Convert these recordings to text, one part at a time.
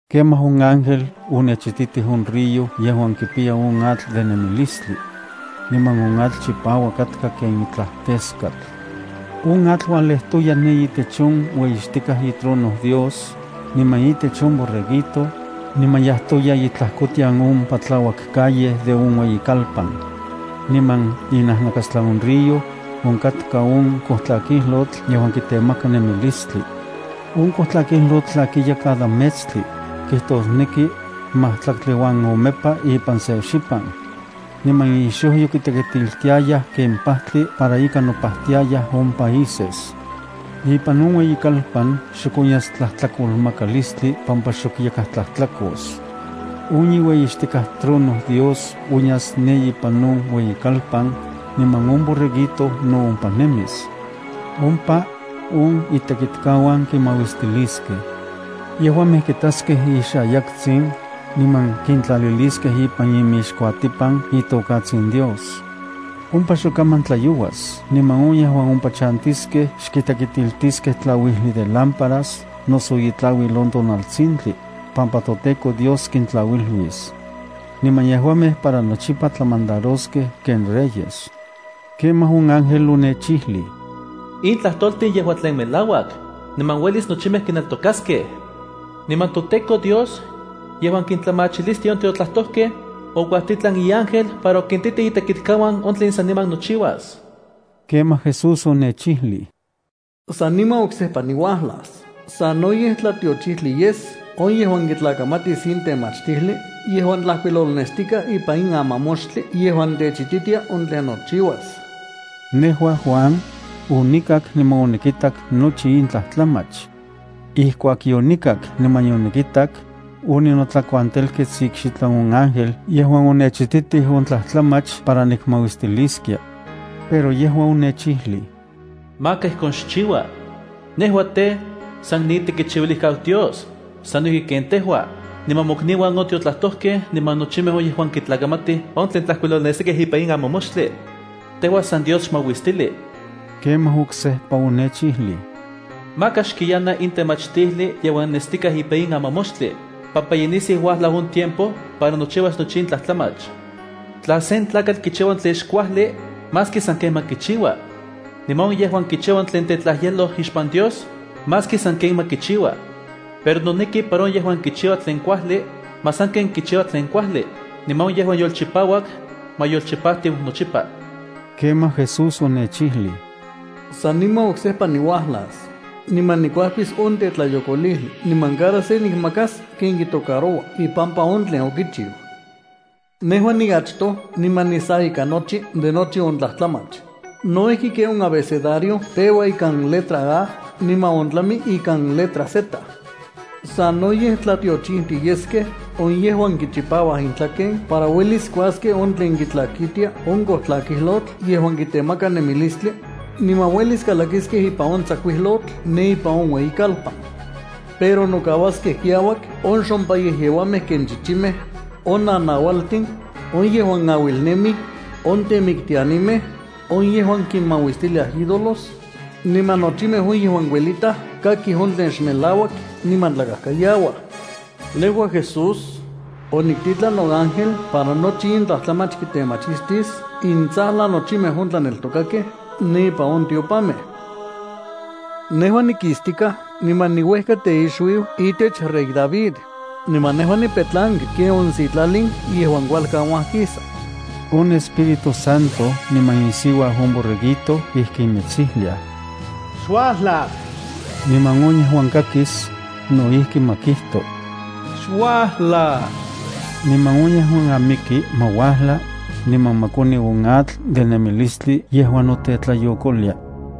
Kemaj on ángel onechititij on río yejuan kipiya on atl de nemilistli. Niman on atl chipauak katka ken itlaj teskatl. On atl ualejtoya ne itech on ueyixtikaj itrono Dios, niman itech on Borreguito, niman yajtoya itlajkotian on patlauak calle de on ueyikalpan. Niman inajnakastlan on río, onkatka on kojtlakijlotl yejuan kitemaka nemilistli. On kojtlakijlotl tlakiya cada metstli, kijtosneki majtlaktli uan omepa ipan se xipan. Niman ixojyo kitekitiltiayaj ken pajtli para ika nopajtiayaj on países. Ipan on ueyikalpan xok onyas tlajtlakomakalistli pampa xok yakaj tlajtlakos. On iueyixtikaj trono Dios onyas ne ipan on ueyikalpan, niman on Borreguito no ompa nemis. Ompa on itekitkauan kimauistiliskej. Yejuamej kitaskej ixayaktsin, niman kintlaliliskej ipan inmixkuatipan itokatsin Dios. Ompa xok kaman tlayouas, niman on yejuan ompa chantiskej xkitekitiltiskej tlauijli de lámparas noso itlauil on tonaltsintli, pampa toTEKO Dios kintlauiluis. Niman yejuamej para nochipa tlamandaroskej ken reyes. Kemaj on ángel onechijlij: “In tlajtoltin yejua tlen melauak, niman uelis nochimej kineltokaskej. Niman toTEKO Dios, yejuan kintlamachilistia on tiotlajtojkej, okuajtitlan iángel para okintitij itekitkauan on tlen saniman nochiuas.” Kemaj Jesús onechijlij: “¡Saniman oksejpa niuajlas! Sanoyej tlatiochijtli yes on yejuan kitlakamatis in temachtijli yejuan tlajkuilolnestikaj ipan in amamoxtli yejuan techititia on tlen nochiuas.” Nejua, Juan, onikak niman onikitak nochi in tlajtlamach. Ijkuak yonikak niman yonikitak, oninotlakuantelkets ikxitlan on ángel yejuan onechititij on tlajtlamach para nikmauistiliskia. Pero yejua onechijlij: “Maka ijkon xchiua. Nejua tej, san niitekichiuilijkau Dios, sano ijki ken tejua, niman mokniuan on tiotlajtojkej niman nochimej on yejuan kitlakamatij on tlen tlajkuilolnestikaj ipan in amamoxtli. Tejua san Dios xmauistili.” Kemaj oksejpa onechijlij: “Maka xkiyana in temachtijli yejuan nestikaj ipan in amamoxtli, pampa ye nisiu uajlau on tiempo para nochiuas nochi in tlajtlamach. Tla sen tlakatl kichiua on tlen xkuajli, maski sanken ma kichiua. Niman on yejuan kichiua on tlen tetlajyeloj ixpan Dios, maski sanken ma kichiua. Pero noneki para on yejuan kichiua tlen kuajli, ma sanken kichiua tlen kuajli, niman on yejuan yolchipauak, ma yolchipajtiu nochipa.” Kemaj Jesús onechijlij: “Saniman oksejpa niuajlas, niman nikuajkis on tetlayokolijli. Niman cada se nikmakas ken kitocaroua ipampa on tlen okichiu. Nejua niachtoj niman nisa ika nochi de nochi on tlajtlamach, no ijki ken on abecedario peua ikan letra A niman ontlami ikan letra Z.” Sanoyej tlatiochijtiyeskej on yejuan kichipauaj intlaken para uelis kuaskej on tlen kitlakitia on kojtlakijlotl yejuan kitemaka nemilistli, niman uelis kalakiskej ipan on tsakuijlotl ne ipan on ueyikalpan. Pero nokauaskej kiauak on xompayejyeuamej ken chichimej, on nanaualtin, on yejuan auilnemij, on temiktianimej, on yejuan kinmauistiliaj ídolos, niman nochimej on yejuan kuelitaj kakij on tlen xmelauak niman tlakajkayauaj. Niman Jesús okijtoj: —Nejua, Jesús, oniktitlan noángel para nochi in tlajtlamach kitemachistis intsajlan nochimej on tlaneltokakej ne ipan on tiopamej. Nejua nikistikaj niman niuejka teixuiu itech rey David, niman nejua nipetlanki ken on sitlalin yejuan kualkan uajkisa. On Espíritu Santo niman isiuau on Borreguito ijkin mitsijlia: “¡Xuajla!” Niman on yejuan kakis, no ijki ma kijto: “¡Xuajla!” Niman on yejuan amiki, ma uajla, niman ma koni on atl de nemilistli yejuan notetlayokolia.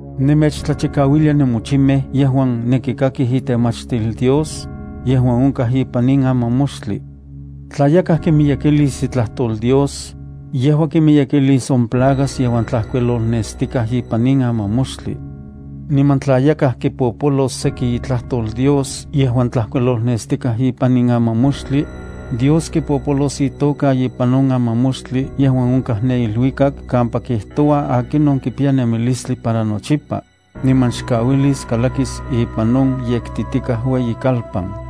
Nemechtlachikauilia nenmochimej yejuan nenkikakij itemachtil Dios, yejuan onkaj ipan in amamoxtli: Tla yakaj kimiyekilis itlajtol Dios, yejua kimiyekilis on plagas yejuan tlajkuilolnestikaj ipan in amamoxtli. Niman tla yakaj kipopolos seki itlajtol Dios yejuan tlajkuilolnestikaj ipan in amamoxtli, Dios kipopolos itoka ipan on amamoxtli yejuan onkaj ne iluikak kampa kijtoua akinon kipiya nemilistli para nochipa, niman xkauilis kalakis ipan on yektitikaj ueyikalpan.